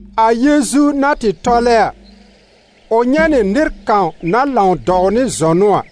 A Yeezu na tɩ tɔlɛ a, ʋ nyɛ̃ nɩ nɩr kãw na lãw dɔw nɩ zɔnʋ a.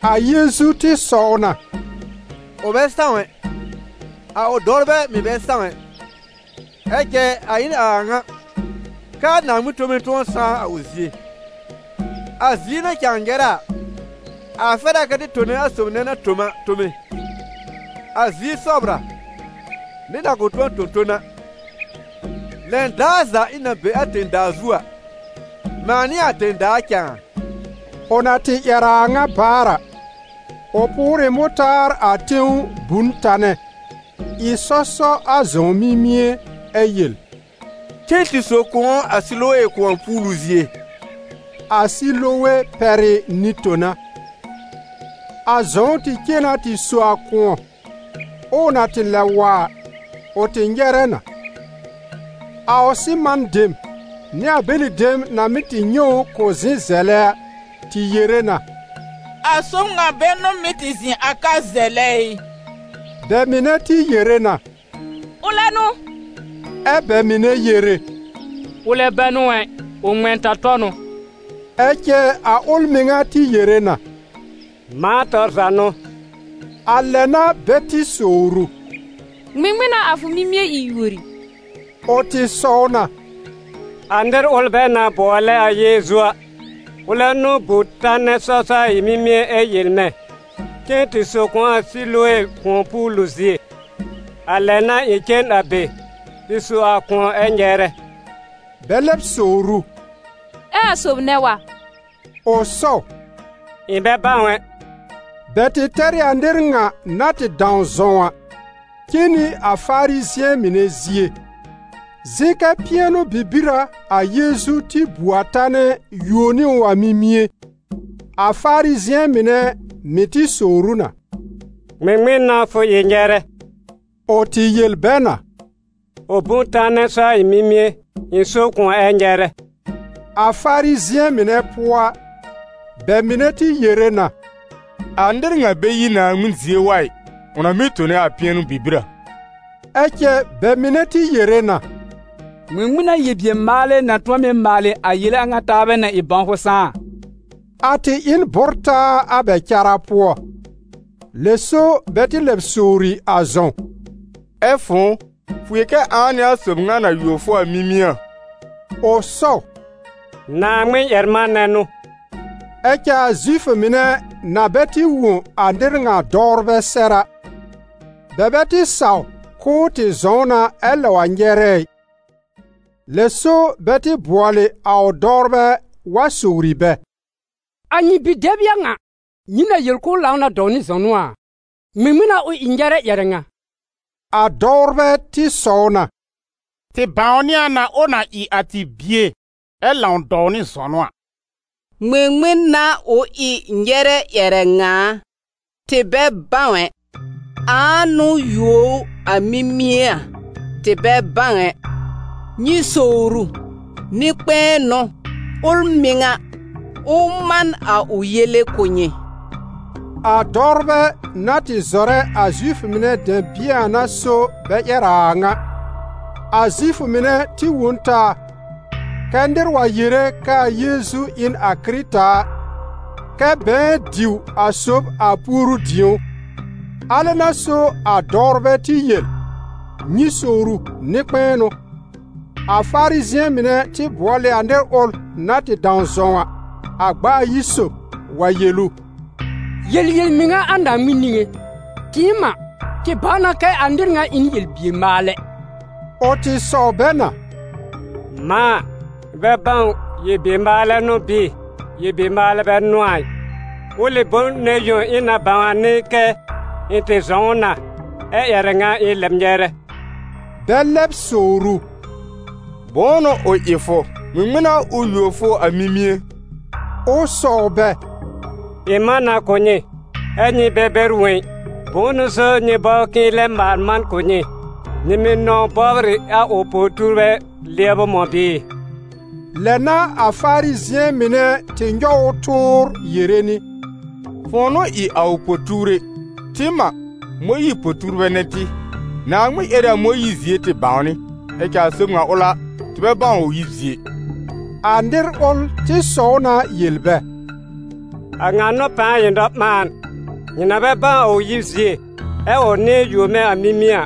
A Yeezu tɩ sɔw na: «Ʋ bɛ sãw ɛ, a ʋ dɔwrbɛ mɩ̀ bɛ sãw ɛ. Ɛ cɛ a ɩ n a a ŋa, kɛ a Naaŋmɩn tome tʋ̃ɔ sãá a ʋ zie. A zie na cãa nyɛrɛ a, a fɛr a kɛ tɩ tone a sob nɛ na tõ m a tome; a zie sɔbr a, nɩr na kʋ̃ tʋ̃ɔ tõ ton a. Lɛn daar za ɩ̃ na be a tẽ-daa zu a, mãa n'ɩ a tẽ-daa cãa.» Ʋ na tɩ ƴɛr a a ŋa baar a, ʋ pʋʋr ɩ mʋtaar a tẽw bu n tanɛ, ɩ sɔ sɔ a zɔ̃w mimie ɛ yel: «Cen tɩ so kʋ̃ɔ a Silowe kʋ̃ɔ-puulu zie», a Silowe pɛr ɩ «Nɩ-tona». A zɔ̃w tɩ cen na tɩ so a kʋ̃ɔ, ɛ ʋ na tɩ lɛb wa a, ʋ tɩ nyɛrɛ na. A ʋ sɩman dem, nɩ a bɛlɩ dem na mɩ́ tɩ nyɛ̃ ʋ k'ʋ zɩ̃ zɛlɛ a, tɩ yere na: «A sob ŋa bɛ n'ʋ mɩ́ tɩ zɩ̃ a ka zɛlɛ ɩ?» Bɛ mɩnɛ tɩ yere na: «Ʋlɛ n'ʋ!» Ɛ bɛ mɩnɛ yere: «Ʋlɛ bɛ n'ʋ ɛ, ʋ ŋmɛ̃-ta-tɔ n'ʋ.» Ɛ cɛ a ʋl mɩŋa tɩ yere na: «Mãa tɔr za n'ʋ.» A lɛ n'a bɛ tɩ sowr ʋ: «Ŋmɩŋmɩn n'a a fʋ mimie ɩ yuori?» Ʋ tɩ sɔw na: «A nɩr ʋl bɛ na bʋɔlɛ a Yeezu a, ʋlɛ n'ʋ bu tanɛ sɔ sɔ a ɩ̃ mimie ɛ yel mɛ̃: ‹Cen tɩ so kʋ̃ɔ a Silowe kʋ̃ɔ-puulu zie›. A lɛ n'a ɩ̃ cen a be, tɩ so a kʋ̃ɔ ɛ nyɛrɛ.» Bɛ lɛb sowr ʋ: «Ɛ a sob nɛ wa?» Ʋ sɔw: «Ɩ̃ bɛ bãw ɛ.» Bɛ tɩ tɛr ɩ a nɩr ŋa, na tɩ dãw zɔ̃w a, cen nɩ a Farizɩ̃ɛ mɩnɛ zie. Zɩ̃ kɛ̃ pɩɛnʋ-bibir a a Yeezu tɩ bu a tanɛ yuo nɩ ʋ a mimie. A Farizɩ̃ɛ mɩnɛ mɩ̀ tɩ sowr ʋ na: «Ŋmɩŋmɩn n'a fʋ ɩ nyɛrɛ?» Ʋ tɩ yel bɛ na: «Ʋ bu n tanɛ sɔ a ɩ̃ mimie, ɩ̃ so kʋ̃ɔ ɛ nyɛrɛ.» A Farizɩ̃ɛ mɩnɛ pʋɔ a, bɛ mɩnɛ tɩ yere na: «A nɩr ŋa bɛ yi Naaŋmɩn zie wa ɩ, ʋ na mɩ́ tone a pɩɛnʋ-bibir a.» Ɛ cɛ bɛ mɩnɛ tɩ yere na: «Ŋmɩŋmɩn n'a yel-bier-maalɛ na tʋ̃ɔ mɩ́ maalɩ a yele a ŋa taabɛ na ɩ bãwfʋ sãá a?» A tɩ ɩ n bʋ́r-taa a bɛ cara pʋɔ. Lɛ so bɛ tɩ lɛb sowri a zɔ̃w: «Ɛ fʋ̃ʋ, fʋ yel kɛ ãa n'ɩ a sob ŋa na yuo fʋ a mimie a?» Ʋ sɔw: «Naaŋmɩn-ƴɛr-manɛ n'ʋ.» Ɛ cɛ a Zifʋ mɩnɛ na bɛ tɩ wõ a nɩr ŋa dɔwrbɛ sɛr a, bɛ bɛ tɩ saw k'ʋʋ tɩ zɔ̃w na ɛ lɛb wa nyɛrɛ ɩ. Lɛ so bɛ tɩ bʋɔl ɩ a ʋ dɔwrbɛ wa sowri bɛ: «A nyɩ bi-dɛb n'ɩ a ŋa nyɩ na yel k'ʋʋ lãw na dɔw nɩ zɔnʋ a? Ŋmɩŋmɩn n'a ʋ ɩ nyɛrɛ ƴɛrɛ ŋa?» A dɔwrbɛ tɩ sɔw na: «Tɩ bãwnɩ a na ʋ na ɩ a tɩ bie, ɛ lãw dɔw nɩ zɔnʋ a. Ŋmɩŋmɩn n'a ʋ ɩ nyɛrɛ ƴɛrɛ ŋa a, tɩ bɛ bãw ɛ. Ãa n'ʋ yuo ʋ a mimie a? Tɩ bɛ bãw ɛ. Nyɩ sowr ʋ, nɩ-kpɛ̃ɛ n'ʋ, ʋl mɩŋa, ʋ man a ʋ yele kʋ̀ nyɩ!» A dɔwrbɛ na tɩ zɔrɛ a Zifʋ mɩnɛ dɛ̃bɩ̃ɛ a n'a so bɛ ƴɛr a a ŋa. A Zifʋ mɩnɛ tɩ wõ n taa, kɛ́ nɩr wa yere kɛ a Yeezu ɩ n a Kɩrɩta a, kɛ bɛ̃ɛ diw a sob a puoru-dĩ̀ó. Alɛ n'a so a dɔwrbɛ tɩ yel: «Nyɩ sowr ʋ, nɩ-kpɛ̃ɛ n'ʋ!» A Farizɩ̃ɛ mɩnɛ tɩ bʋɔl ɩ a nɩr ʋl na tɩ dãw zɔ̃w a, a gb'a ayi sob, wa yel ʋ: «Yel yel-mɩŋa a Naaŋmɩn niŋé. Tɩɩm a, tɩ bãw na kɛ a nɩr ŋa ɩ n yel-bier-maalɛ.» Ʋ tɩ sɔw bɛ na: «Mãa a, ɩ̃ bɛ bãw yel-bier-maalɛ n'ʋ bɩɩ yel-bier-maalɛ bɛ n'ʋ a ɩ, ʋlɩ bom nɛ yõ ɩ̃ na bãw a n'ɩ kɛ ɩ̃ tɩ zɔ̃w na, ɛ ƴɛrɛ ŋa ɩ̃ lɛb nyɛrɛ.» Bɛ lɛb sowr ʋ: «Bʋ̃ʋ n'ʋ ʋ ɩ fʋ? Ŋmɩŋmɩn n'a ʋ yuo fʋ a mimie?» Ʋ sɔw bɛ: «Ɩ̃ man na kʋ̀ nyɩ, ɛ́ nyɩ bɛ bɛr wõ ɩ. Bʋ̃ʋ so nyɩ bɔbr k'ɩ̃ɩ lɛ maal man kʋ̀ nyɩ? Nyɩ mɩ́ nɔ̃w bɔbr ɩ a ʋ po-tuurbɛ lɩɛbʋ mɔ̃ bɩɩ?» Lɛ n'a a Farizɩ̃ɛ mɩnɛ tɩ nyɔw ʋ tʋʋr yere nɩ: «Fʋ̃ʋ n'ʋ ɩ a ʋ po-tuure! Tɩɩm a, Mõyiir po-tuurbɛ n'ɩ tɩ. Naaŋmɩn ƴɛr ɩ a Mõyiir zie tɩ bãwnɩ, ɛ cɛ a sob ŋa ʋl a, tɩ bɛ bãw ʋ yib zie ɩ!» A nɩr ʋl tɩ sɔw na yel bɛ: «A ŋa n'ʋ pãa ɩ nɔ-ɓãan! Nyɩ na bɛ bãw a ʋ yib zie, ɛ ʋ nɩ̃ɛ yuo mɛ̃ a mimie a!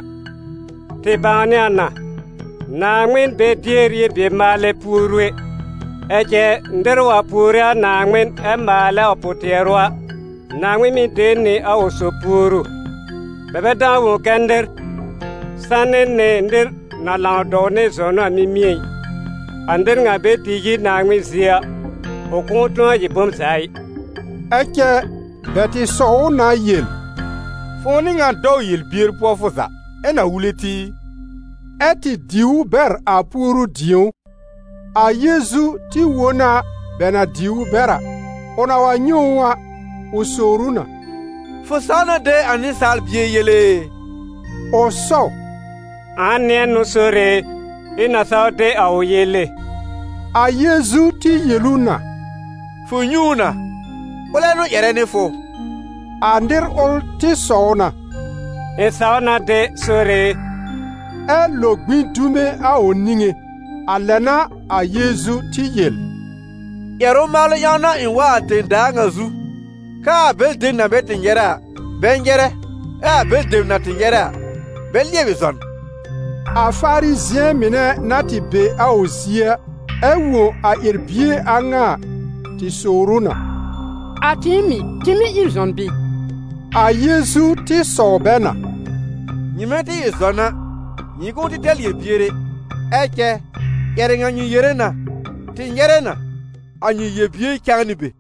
Tɩ bãwnɩ a na: Naaŋmɩn bɛ dier yel-bier-maalɛ puoru ɛ, ɛ cɛ nɩr wa puore Naaŋmɩn ɛ maalɛ a ʋ pʋ-tɩɛrʋ a, Naaŋmɩn mɩ́ de nɩ a ʋ sob puoru. Bɛ bɛ dãw wõ kɛ́ nɩr sanɩ nɩ nɩr na lãw dɔw nɩ zɔnʋ a mimie ɩ. A nɩr ŋa bɛ tɩ yi Naaŋmɩn zie a, ʋ kʋ̃ʋ tʋ̃ɔ ɩ bom za ɩ.» Ɛ cɛ bɛ tɩ sɔw ʋ na yel: «Fʋ̃ʋ n'ɩ ŋan dɔw yel-bier pʋɔ fʋ za, ɛ na wule tɩ ɩ?» Ɛ́ tɩ diw ʋ bɛr a puoru-dĩ̀ó. A Yeezu tɩ wõ na bɛ na diw ʋ bɛr a. Ʋ na wa nyɛ̃ ʋ a, ʋ sowr ʋ na: «Fʋ saw na de a Nɩsaal Bie yele e?» Ʋ sɔw: «Ãa nɩ̃ɛ n'ʋ, Sore e, ɩ̃ na saw de a ʋ yele?» A Yeezu tɩ yel ʋ na: «Fʋ nyɛ̃ ʋ na, ʋlɛ n'ʋ ƴɛrɛ nɩ fʋ!» A nɩr ʋl tɩ sɔw na: «Ɩ̃ saw na de, Sore e.» Ɛ lo gbĩ dume a ʋ niŋé. A lɛ n'a a Yeezu tɩ yel: «Ƴɛrʋ-maalʋ ƴãw n'a ɩ̃ wa a tẽ-daa ŋa zu, kɛ a bɛlɩ dem na bɛ tɩ nyɛrɛ a, bɛ nyɛrɛ, ɛ a bɛlɩ dem na tɩ nyɛrɛ a, bɛ lɩɛbɩ zɔn.» A Farizɩ̃ɛ mɩnɛ na tɩ be a ʋ zie a, ɛ wõ a ƴɛr-bie a ŋa a, tɩ sowr ʋ na: «A tɩɩm mɩ̀, tɩ mɩ̀ ɩ zɔn bɩɩ?» A Yeezu tɩ sɔw bɛ na: «Nyɩmɛ tɩ ɩ zɔn a, nyɩ kʋ̃ʋ tɛr yel-bier ɛ. Ɛ cɛ ƴɛrɛ ŋa nyɩ yere na: ‹Tɩ nyɛrɛ na›: a nyɩ yel-bier cãa nɩ be.»